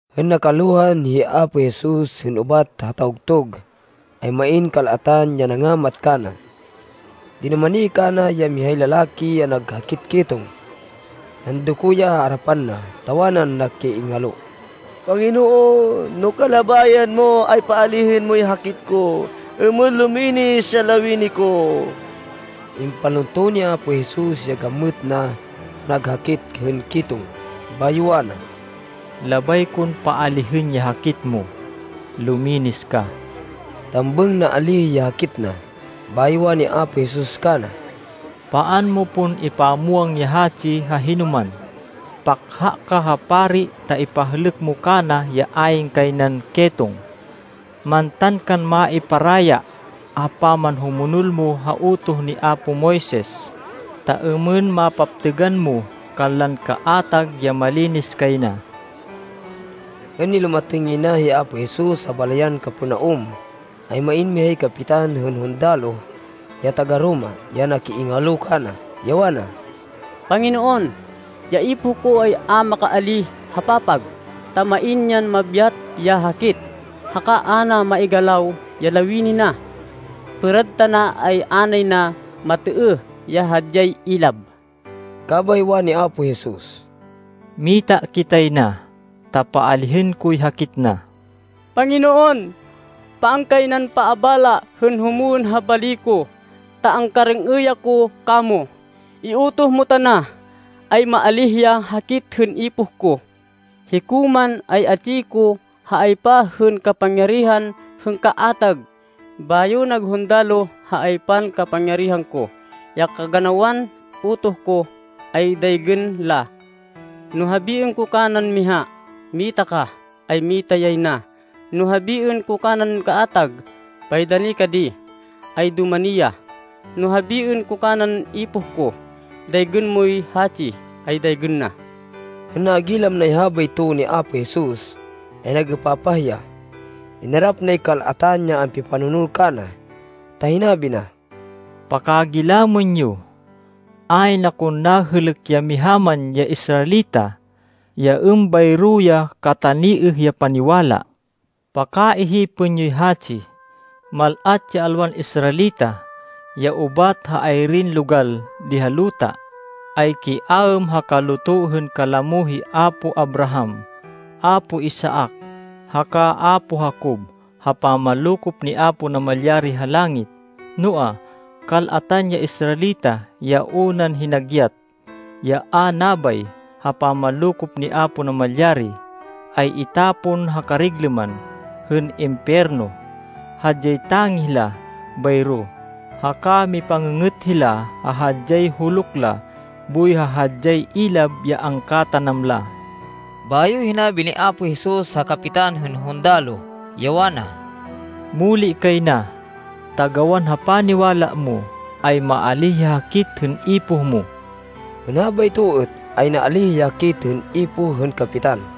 Hên nakalohan hi Apo Jesus hên ubat ha tawgtug, ay main kal-atan ya nangamat kana. Dinumani kana ya mihay lalaki ya nag hakit ketong. Nandoko ya ha arapan na, ta wanan nakiingalo, “Panginoon, no kalabayan mo, ay paalihên moy hakit ko, êmên luminis ya lawini ko.” Impalunto ni Apo Jesus ya gamêt na ha nag hakit hên ketong, bayo wana, “Labay kon paalihên ya hakit mo. Luminis ka!” Tambêng naalíh ya hakit na. Bayo wani Apo Jesus kana, “Paan mo pon ipamwang ya hatsi ha hinoman. Pakha ka ha pari ta ipahlêk mo kana ya ayn kay nan ketong. Mantan kan maiparaya ha pamanhumonol mo ha utoh ni apo Moises, ta êmên mapaptêgan mo kanlan kaatag ya malinis kay na.” Hên nilumatêng yay na hi Apo Jesus ha balayan Capernaum, ay main mihay kapitan hên hundaloh ya taga-Roma ya nakiingalo kana, ya wana, “Panginoon, ya ipoh ko ay a makaalíh ha papag, ta main yan nabyat ya hakit, haka a na maigalaw ya lawini na. Pêrad tana ay a nay na matêêh ya hadyay ilab.” Kabay wani Apo Jesus, “Mita kitay na, ta paalihên koy hakit na.” “Panginoon, paan kay nan paabala hên humwên ha bali ko, ta angkarêng-êy ako kamo. Iutoh mo tana, ay maalíh ya hakit hên ipoh ko. Hiko man, ay atsi ko ha aypa hên kapangyarihan hên kaatag, bayo nag hundaloh ha aypan kapangyarihan ko. Ya kaganawan utoh ko, ay daygên la. No habiên ko kanan miha, ‘Mita ka,’ ay mita yay na. No habiên ko kanan kaatag, ‘Paidani ka di,’ ay dumani ya. No habiên ko kanan ipoh ko, ‘Daygên moy hatsi,’ ay daygên na.” Hên nagilam nay habayto ni Apo Jesus, ay nag-êpapah ya. Inarap nay kal-atan ya ampipanonol kana, ta hinabi na, “Pakagilamên yo, ayn akon nahêlêk ya miha man ya Israelita, ya êmbayro ya kataniêh ya paniwala. Pakaihipên yoy hatsi, mal-at ya alwan Israelita, ya ubat ha ay-irin logal di ha luta, ay kiaêm ha kaluto hên kalamo hi apo Abraham, apo Isaac, haka apo Jacob ha pamanlokop ni Apo Namalyari ha langit. Noa, kal-atan ya Israelita ya unan hinagyat, ya a nabay ha pamanlokop ni Apo Namalyari, ay itapon ha kariglêman hên impiyerno. Hadyay tangih la bayro, haka mipang-ngê-ngêt hila ha hadyay huluk la boy ha hadyay ilab ya angkatanam la.” Bayo hinabi ni Apo Jesus ha kapitan hên hundaloh, ya wana, “Muli kay na, ta gawan ha paniwala mo, ay maalíh ya hakit hên ipoh mo.” Hên habayto êt, ay naalíh ya hakit hên ipoh hên kapitan.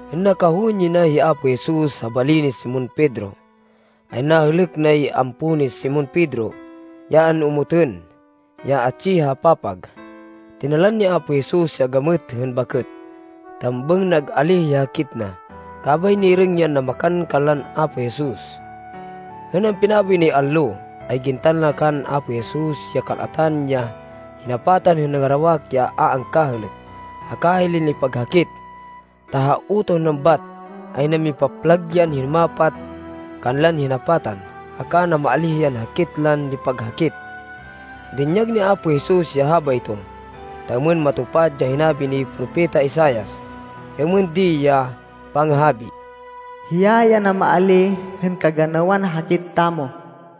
Hên nakahowên yay na hi Apo Jesus ha bali ni Simon Pedro, ay nahêlêk nay ampo ni Simon Pedro, ya an-omotên, ya atsi ha papag. Tinalan ni Apo Jesus ya gamêt hên bakêt. Tambêng nag-alíh ya hakit na, kabay nirêng yan namakan kanlan Apo Jesus. Hên ampinaboy nay allo, ay gintan la kan Apo Jesus ya kal-atan ya hinapatan hên nangarawak ya a angkahêlêk, haka hilay nipaghakit, ta ha utoh nan bat, ay namipaplag yan hinumapat kanlan hinapatan, haka namaalíh yan hakit lan nipaghakit. Dinyag ni Apo Jesus ya habayto, ta êmên matupad ya hinabi ni Propeta Isaias, ya êmên di ya pangahabi, “Hiya ya namaalíh hên kaganawan hakit tamo.”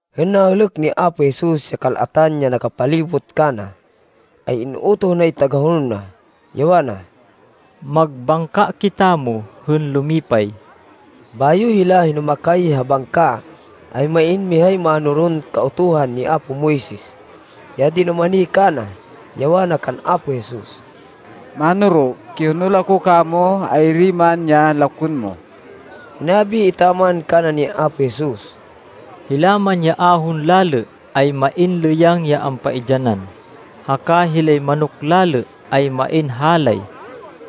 Hên nahêlêk ni Apo Jesus ya kal-atan ya nakapalibot kana, ay in-utoh nay tagahonol na, ya wana, “Magbangka kitamo hên lumipay.” Bayo hila hinumakay ha bangka, ay main mihay mánoron Kautuhan ni apo Moises ya dinumani kana, ya wana kan Apo Jesus, “Mánoro, kihonol ako kamo ay-iri man ya lakwên mo.” Hinabi etaman kana ni Apo Jesus, “Hila man ya ahon lalê ay main lêyang ya ampaidyanan, haka hilay manok lalê ay main halay,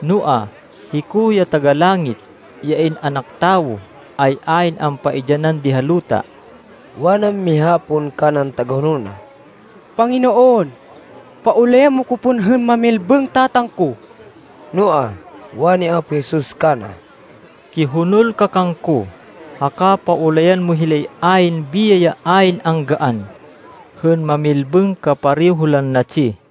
noa, hiko ya Taga-Langit, ya In-anak Tawo, ay ayn ampaidyanan di ha luta.” Wanan miha pon kanan tagahonol na, “Panginoon, paulayan mo ko pon hên mamilbêng tatang ko.” Noa, wani Apo Jesus kana, “Kihonol ka kangko, haka paulayan mo hilay ayn biyay ya ayn anggaan, hên mamilbêng kapareho lan natsi.”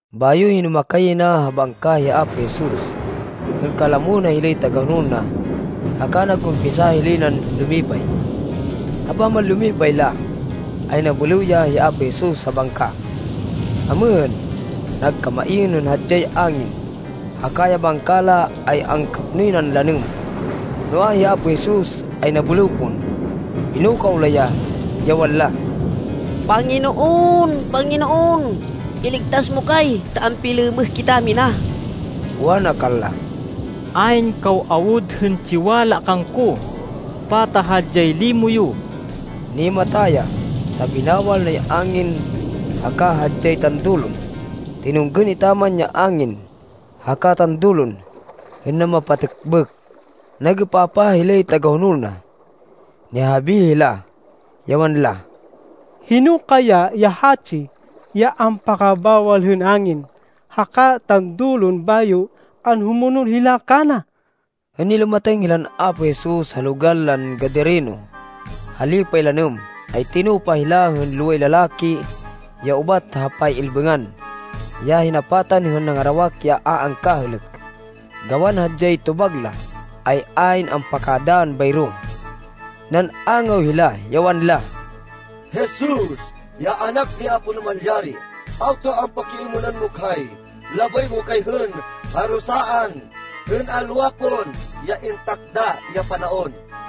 Bayo hinumakay yay na ha bangka hi Apo Jesus, hên kalamo na hilay tagahonol na haka nag-umpisa hilay nan lumipay. Ha pamanlumipay la, ay nabêlêw ya hi Apo Jesus ha bangka. Amêhên, nagkamain hên hadyay angin, haka ya bangka la ay angkapnoy nan lanêm, noa, hi Apo Jesus ay nabêlêw pon. Pinukaw la ya, ya wanla, “Panginoon! Panginoon! Iligtas mo kay, ta ampilêmêh kitamina!” Wana kanla, “Ayn kaw awud hên tsiwala kangko! Pata hadyay limo yo!” Nimata ya, ta binawal nay angin haka hadyay tandulon. Tinunggên etaman ya angin haka tandulon, hên namapatêkbêk. Nag-êpapah hilay tagahonol na. Nihahabi hila, ya wanla, “Hino kaya ya hatsi ya ampakabawal hên angin haka tandulon bayo anhumonol hila kana?” Hên nilumatêng hilan Apo Jesus ha logal lan Gadareno, ha lipay lanêm, ay tinupa hila hên loway lalaki ya ubat ha pay-ilbêngan, ya hinapatan hên nangarawak ya a angkahêlêk. Gawan hadyay tobag la, ay ayn ampakadann bayro. Nan-angaw hila, ya wanla, “Jesus, ya Anak ni Apo Namalyari, awta ampakiêmênan mo kay? Labay mo kay hên parusaan hên alwa pon ya intakda ya panaon?”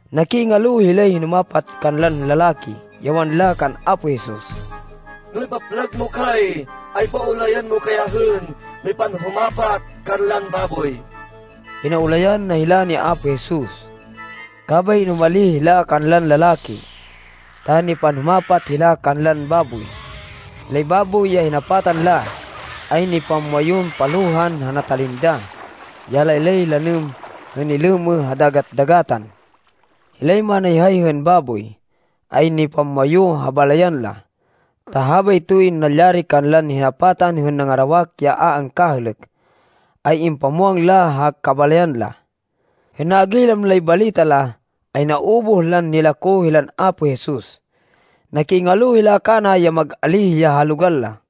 Nakiingalo hilay hinumapat kanlan lalaki, ya wanla kan Apo Jesus, “No ipaplag mo kay, ay paulayan mo kay hên mipanhumapat kanlan baboy.” Pinaulayan na hila ni Apo Jesus. Kabay inumalih hila kanlan lalaki, ta nipanhumapat hila kanlan baboy. Hilay baboy ya hinapatan la, ay nipamwayun palohan ha natalindah ya laylay lanêm hên nilêmêh ha dagat-dagatan. Hilay manayhay hên baboy, ay nipamwayu ha balayan la, ta habaytoy nalyari kanlan hinapatan hên nangarawak ya a angkahêlêk, ay impamwang la ha kabalayan la. Hên nagilam lay balita la, ay naubuh lan nilako hilan Apo Jesus. Nakiingalo hila kana ya mag-alíh ya ha logal la.